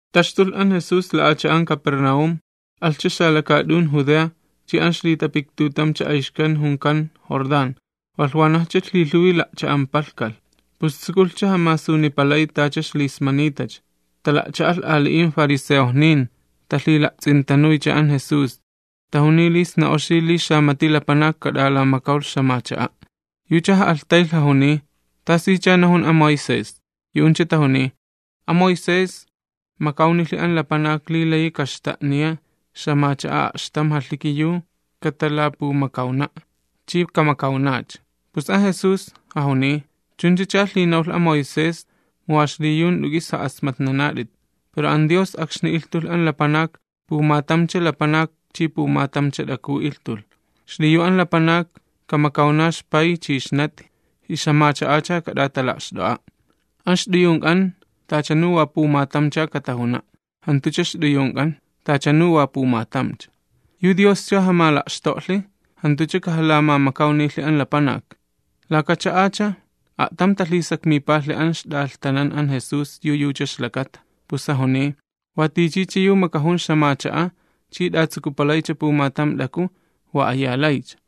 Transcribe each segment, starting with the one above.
Taxtulh an Jesús la'acha'an Capernaúm, alhcha xalakaat'un Judea chi an ixlitapiktutamcha ayxkan junkan Jordán, walh wanajcha lhilhuwi la'cha'ampalakalh, pus tsukulhcha jamasunipalay tacha ixlismanitacha. Tala'cha'alh ali'in fariseojnin talhila'ts'intanuycha an Jesús, tajuniy li sna oxi li xamati lapanak kamakawlh ixt'iwi'. Yucha ja'alhtaylh jajuniy: ―¿Tasicha tajunin an Moisés? Yu'uncha tajuniy: ―An Moisés, makawnilhi an lapanak li layi kaxta'niya ixt'iwi la'atam jalhiki yu katalapumakawna', chi kamakawnacha. Pus an Jesús jajuniy: ―Chunchacha lhinawlh an Moisés mu wa xliyu jant'u k'is ja'asmatnanat'it. Pero an Dios akxni ilhtulh an lapanak “ilhtulhcha an lapanak chi ilhtulhcha an t'aku'”. “Xliyu an lapanak, kamakawna ixpay chi ixnati, ixt'iwicha kat'atala'xt'o'a'. An ixt'uyunk'an tachanu wa pumatamcha katajuna'”, jantucha ixt'uyunk'an, tachanu wa pumatamcha. Yu Dioscha jamala'xto'lhi jantucha kajalamamakawnilhi an lapanak. Laka cha'acha, a'tam talhisakmipalhi an ixt'alhtanan an Jesús yu yucha ixlakata. Pus jajuniy: ―Wa tichicha yu makajun ixt'iwi chi t'atsukupalaycha pumatam t'aku, tala'alhincha ilhtuy.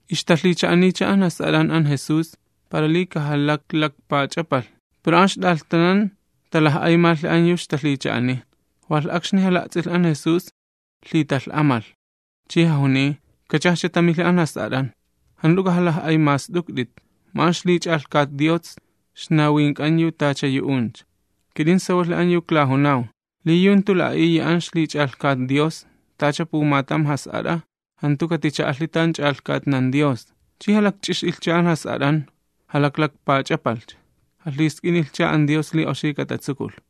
Ixtalhicha'aniycha an jas'at'an an Jesús para li kajalaklakpach'apalh, pero an ixt'alhtanan talaj'aymastuklhi an yu ixtalhicha'aniy. Walh akxni jala'ts'ilh an Jesús lhitalh'amalh chi jajuniy: ―Kachajcha tamilhi an jas'at'an, jant'u k'ajalaj'aymast'ukt'it, mu an ixlich'alhkat Dios ixnawink'an yu tacha yu'uncha. Kit'in sawalhi an yu klajunaw li yu jantu la'a'iya an ixlich'alhkat Dios tacha pumatam jas'at'a, jantu katicha'alhi tan ch'alhkatnan Dios. Chi jalakch'ix'ilhcha an jas'at'an, jalaklakpach'apalhcha, jalhisk'inilhcha an Dios li oxi katatsukulh.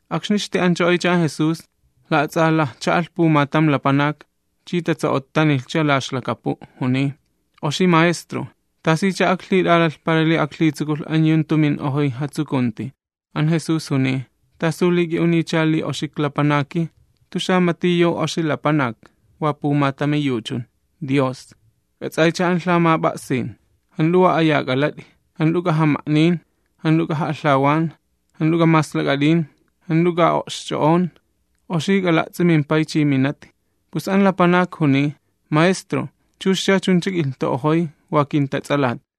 Akxni ixti'ancho'oycha an Jesús, la'ats'alajcha'alh pumatam lapanak, chi tatso'ottanilhcha la ixlakapu', juniy: ―Oxi maestro, ¿tasicha aklhit'aalalh para li aklhitsukulh an yu jantu min'ojoy jatsukunti? An Jesús juniy: ―¿T'asu li k'i'uniycha li oxi klapanaki? Jantu xamati yu oxi lapanak, wa pumatami yu chun, Dios. K'ats'aycha an lhamap'a'sin: “Jant'u wa aya k'alat'i, jant'u k'ajama'nin, jant'u k'aja'alhawan, jant'u k'amaslak'at'in, jant'u k'aja'o'xch'o'on, oxi k'ala'ts'i mimpay chi minati.” Pus an lapanak juniy: ―Maestro, chuxcha chuncha ik'ilhtu'ojoy wa kintats'alat.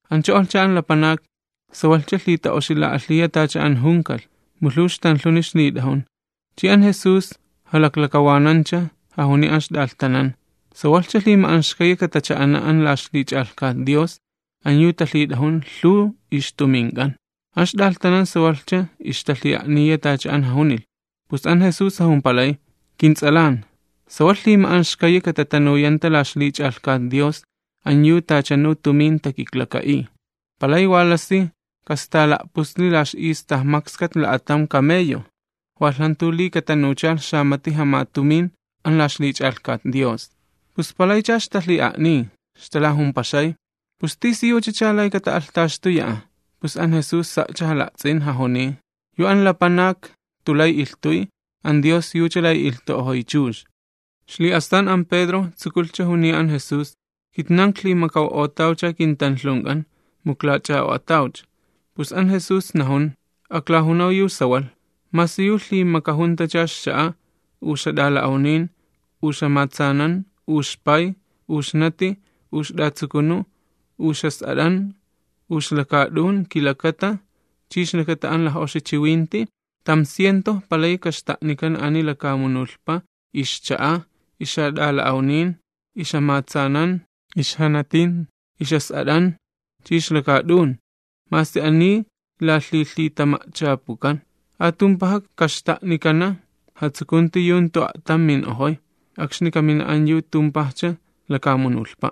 Ancho'olhcha an lapanak, sawalhcha lhita'oxila'alhiya tacha an junikalh, mu lhuw ixtanlhuni ixlit'ajun. Chi an Jesús jalaklakawanancha, jajuniy an ixt'alhtanan: ―¡Sawalhcha lhima'anxkayi katacha'ana an la ixlich'alhkat Dios an yu talhit'ajun lhuw ixtumink'an! An ixt'alhtanan sawalhcha ixtalhi'a'niya tacha an jajunilh, pus an Jesús jajumpalay: ―Kints'alan, ¡sawalh lhima'anxkayi katatanuyanta la ixlich'alhkat Dios an yu tachanu tumin takiklaka'iy! Palay wa lasi kastaala'pusli la ix'ista makskat la'atam camello, walh jantu li katanuchalh xamati jamatumin an la ixlich'alhkat Dios. Pus palaycha ixtalhi'a'niy, ixtalajumpaxay: ―¿Pus tisiyuchacha lay kata'alhtaxtuya'a? Pus an Jesús sa'cha jala'ts'in, jajuniy: ―Yu an lapanak jantu lay ilhtuy, an Dios yucha layi ilhtu'ojoy chux. Xli'astan an Pedro tsukulhcha juniya an Jesús: ―Kitnan iklhimakaw'otawcha kintanlhunk'an, mu iklach'a'o'atawcha. Pus an Jesús najun: ―Aklajunaw yu sawalh, masi yu lhimakajuntacha ixcha'a, u ixjat'ala'awnin, u ixjamatsanan, u ixpay, u ixnati, u ixt'iwi, u ixjas'at'an, u ixlakaat'un, kilakata chi ixlakata an laj'oxi chiwinti, tam cientoj palayi kaxta'nikana ani lakamunulhpa: ixcha'a, ixjat'ala'awnin, ixjamatsanan, ixnatin, ixjas'at'an chi ixlakaat'un, masi ani lalhilhitama'chapukan. Atumpaja kaxta'nikana jatsukunti yu jantu a'tam min'ojoy, akxni kamina an yu tumpajcha lakamunulhpa'.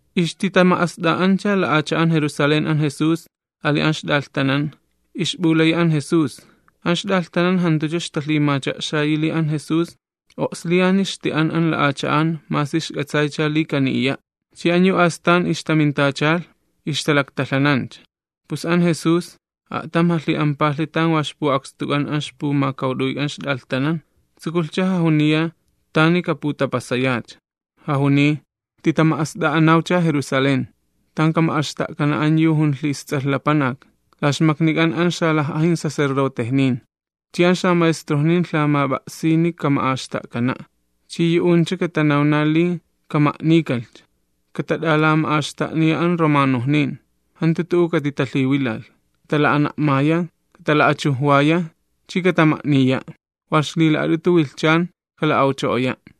Ixtitatama'ast'a'ancha la'acha'an Jerusalén an Jesús ali an ixt'alhtanan, ixp'ulayi an Jesús, an ixt'alhtanan jantucha ixtalhimacha'xayi li an Jesús o'sliyani ixti'an an la'acha'an masi ixk'atsaycha li kaniya', chi an yu astan ixtamintachalh ixtalaktalhanancha. Pus an Jesús a'tam jalhi'ampalhi tan wa ixpu'akstuk'an an ixpumakawt'uyk'an ixt'alhtanan, tsukulhcha jajuniya tani kaputapasayacha, jajuniy: ―Titama'ast'a'anawcha Jerusalén, tan kama'axta'kana an yu junlhi isTs'alh Lapanak. La xmaknik'an an xalaj'ajin sacerdotejnin, chi an xamaestrojnin lhamap'a'sini kama'axta'kana', chi yu'uncha katanawna li kama'nikalhcha. Katama'axt'a'a la xmaknik'an an yu jantu judiojnin. Jantu tu'u katitalhiwilalh, katala'ana'maya, katala'achujwaya, chi katama'niya', walh ixlila'at'utu wilhchan kala'awcho'oya'.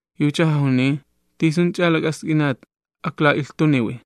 Yucha jajuniy: ―¿Tisunch'a lak'ask'inat akla'ilhtuniwi?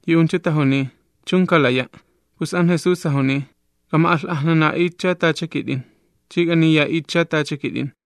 Yu'uncha tajuniy: ―¡Chun, kalaya'! Pus an Jesús jajuniy: ―K'ama'alh'ajnana'itcha tacha kit'in, chi k'aniya'itcha tacha kit'in.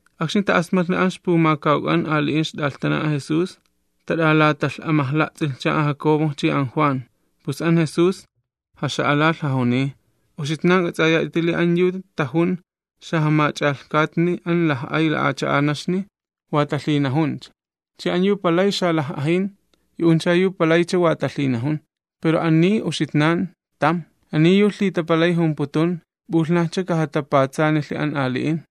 Akxni ta'asmatlhi an ixpumakawk'an ali'in ixt'alhtanan an Jesús, tat'alatalh'amajla'ts'ilhcha an Jacobo chi an Juan. Pus an Jesús, jaxalalh jajuniy: ―Uxitnan k'ats'ayat'iti li an yu tajun xajamach'alhkatni an laj'ay la'acha'anaxni wa talhinajuncha, chi an yu palay xalaj'ajin, yu'uncha yu palaycha wa talhinajun. Pero ani uxitnan, tam. Ani yu lhitapalay jumputun p'ulhnajcha kajatapatsanilhi an ali'in.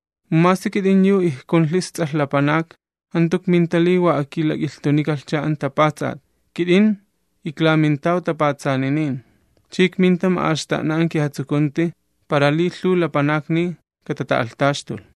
Mu masi kit'in yu ikjunlhi isTs'alh Lapanak, jantu ikminta li wa akilak'ilhtunikalhcha an tapatsat, kit'in iklamintaw tapatsaninin, chi ikminta ma'axta'na an kijatsukunti para li lhuw lapanakni katata'alhtaxtulh.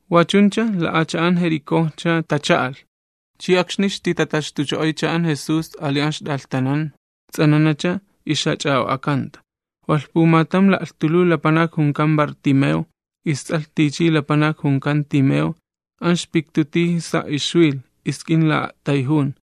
Wachuncha la'acha'an Jericojcha tacha'alh. Chi akxni ixtitataxtucho'oycha an Jesús ali an ixt'alhtanan ts'ananacha ixjach'a'o'akanta. Walh pumatam la'lhtuluw lapanak junkan Bartimeo, ists'alh tichi lapanak junkan Timeo, an ixpiktu tiji sa' ixwilh, isk'in la'a'tayjun.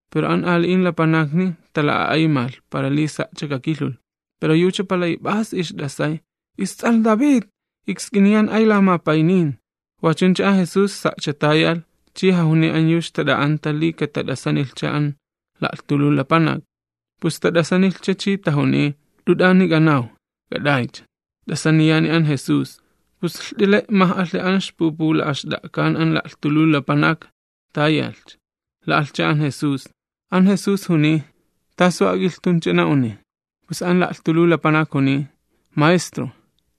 Pero an ali'in lapanakni tala'a'aymalh para li sa'cha kakilhulh. Pero yucha palay p'as ixt'asay: ―¡Ists'alh David lamapaynin ak'ilhi'a't'ay'ut'i! Wachuncha an Jesús sa'cha tayalh, chi jajuniy an yu ixtat'a'anta li katat'asanilhcha an la'lhtuluw lapanak, pus tat'asanilhcha chi tajuniy: ―Jant'u t'ani k'anaw, k'at'aycha, t'asaniyani an Jesús. Pus lht'ele' maj'alhi an ixpupula'axt'a'kan an la'lhtuluw lapanak, tayalhcha, la'alhcha an Jesús. An Jesús juniy: ―¿Tasu ak'ilhtunch'a na'uni? Pus an la'lhtuluw lapanak juniy: ―Maestro,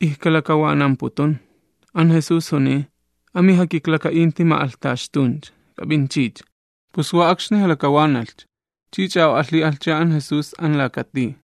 ijkalakawanamputun. An Jesús juniy: ―An mijakiklaka'inti p'ut'ak'uch'ut'icha, k'ap'inchicha. Pus wa akxni jalakawanalhcha, chi ch'a'o'alhi'alhcha an Jesús an laka tij.